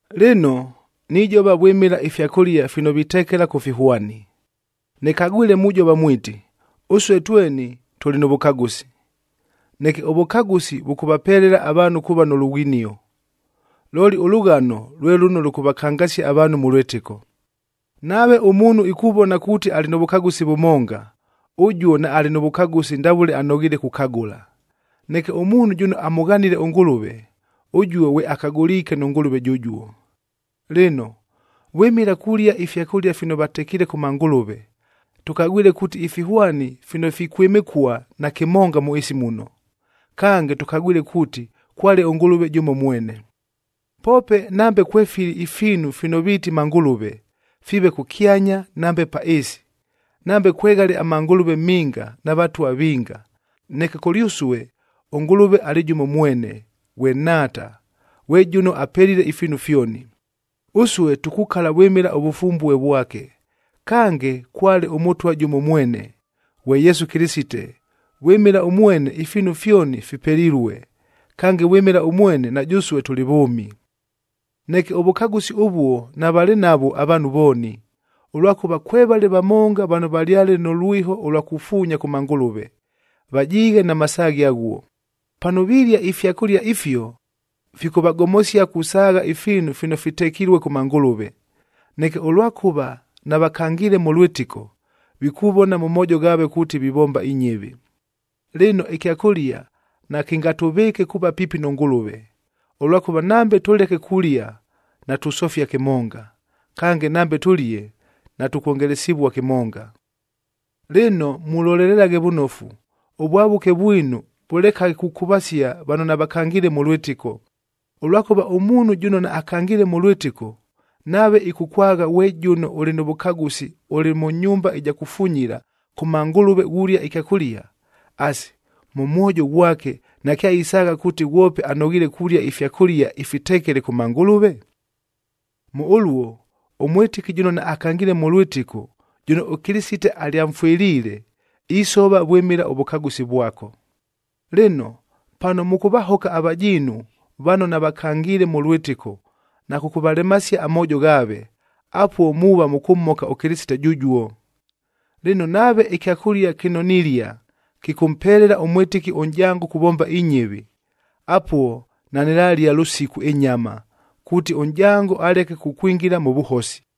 Lɨno, nijova vwɨmɨla ifyakʉlia fino vitekela kʉ fihwani.a Nɨkagwile mujova mwiti, “Ʉsue tweni tʉlɨ nʉ vʉkagʉsi.” Neke ʉvʉkagʉsi vʉkʉvapelela avaanhu kuuva nʉ lughinio. Looli ʉlʉghano lwe lʉno lʉkʉvakangasia avaanhu mʉ lwɨtɨko. Nave ʉmuunhu ikuvona kuuti alɨ nʉ vʉkagʉsi vʉmonga, ʉjuo naalɨ nʉ vʉkagʉsi ndavʉle anoghiile kukagʉla. Neke ʉmuunhu jʉno amʉghanile ʉNgʉlʉve, ʉjuo ghwe akagʉliike nʉ Ngʉlʉve jʉjuo. Lɨno, vwɨmɨla kulia ifyakʉlia fino vatekiile kʉ mangʉlʉve, tʉkagwile kuuti ifihwani fino fikwɨmɨkua, nakɨmonga mʉ ɨɨsi muno. Kange, tʉkagwile kuuti kwale ʉNgʉlʉve jʉmo mwene. Poope nambe kwefili ifiinu fino viiti mangʉlʉve, fiive kʉkyanya nambe pa ɨɨsi; nambe kweghale amangʉlʉve minga na vatwa vinga, neke kʉlyʉsue ʉNgʉlʉve alɨ jʉmo mwene, ghwe Nhaata, ghwe jʉno apelile ifiinu fyoni. Ʉsue tukukala vwɨmɨla ʉvʉfumbue vwake. Kange, kwale ʉMʉtwa jʉmo mwene, ghwe Yesu Kɨlɨsite, vwɨmɨla ʉmwene ifiinu fyoni fipelilue, kange vwɨmɨla ʉmwene na jʉsue tʉlɨ vʉʉmi. Neke ʉvʉkagʉsi ʉvuo navalɨ navwo avaanhu vooni, ʉlwakʉva kwevale vamonga vano valyale nʉ lwiho ʉlwa kufuunya kʉ mangʉlʉve, vajiighe na masaaghe aghuo. Pano vilia ifyakʉlia ifio, fikʉvagomosia kusaagha ifiinu fino fitekilue kʉ mangʉlʉve. Neke ʉlwakʉva navakangiile mʉ lwɨtɨko, vikuvona mʉ moojo ghaave kuuti vivomba inyɨvi. Lɨno, ɨkyakʉlia nakɨngatʉvɨɨke kuuva piipi nʉ Ngʉlʉve, ʉlwakʉva nambe tʉleke kulia, natusofia kɨmonga, kange nambe tʉlie, natʉkwongelesivua kɨmonga. Lɨno, mulolelelaghe vʉnofu, ʉvwavʉke vwinu vʉlekaghe kukʉvasia vano navakangiile mʉ lwɨtɨko. Ʉlwakʉva ʉmuunhu jʉno naakangiile mʉ lwɨtɨko, nave ɨkʉkwagha ghwe jʉno ʉlɨ nʉ vʉkagʉsi ʉlɨ mʉ nyumba ɨja kufunyila kʉ mangʉlʉve ghulia ɨkyakʉlia, asi, mʉ mwojo ghwake nakyaisaagha kuuti ghwope anoghiile kulia ifyakʉlia ifitekele kʉ mangʉlʉve? Mʉ ʉluo, ʉmwɨtɨki jʉno naakangiile mʉ lwɨtɨko, jʉno ʉKɨlɨsite alyamfwɨliile, isova vwɨmɨla ʉvʉkagʉsi vwako. Lɨno, pano mʉkʉvahoka avajiinu vano navakangiile mʉ lwɨtɨko na kʉkʉvalemasia amoojo ghaave, apuo muuva mʉkʉmhoka ʉKɨlɨsite jʉjuo. Lɨno, nave ɨkyakʉlia kɨno nilia, kɨkʉmpelela ʉmwɨtɨki ʉnʼjango kuvomba inyɨvi, apuo nanɨlalia lʉsiku ɨnyama, kuuti ʉnʼjango aleke kukwingila mʉ vʉhosi.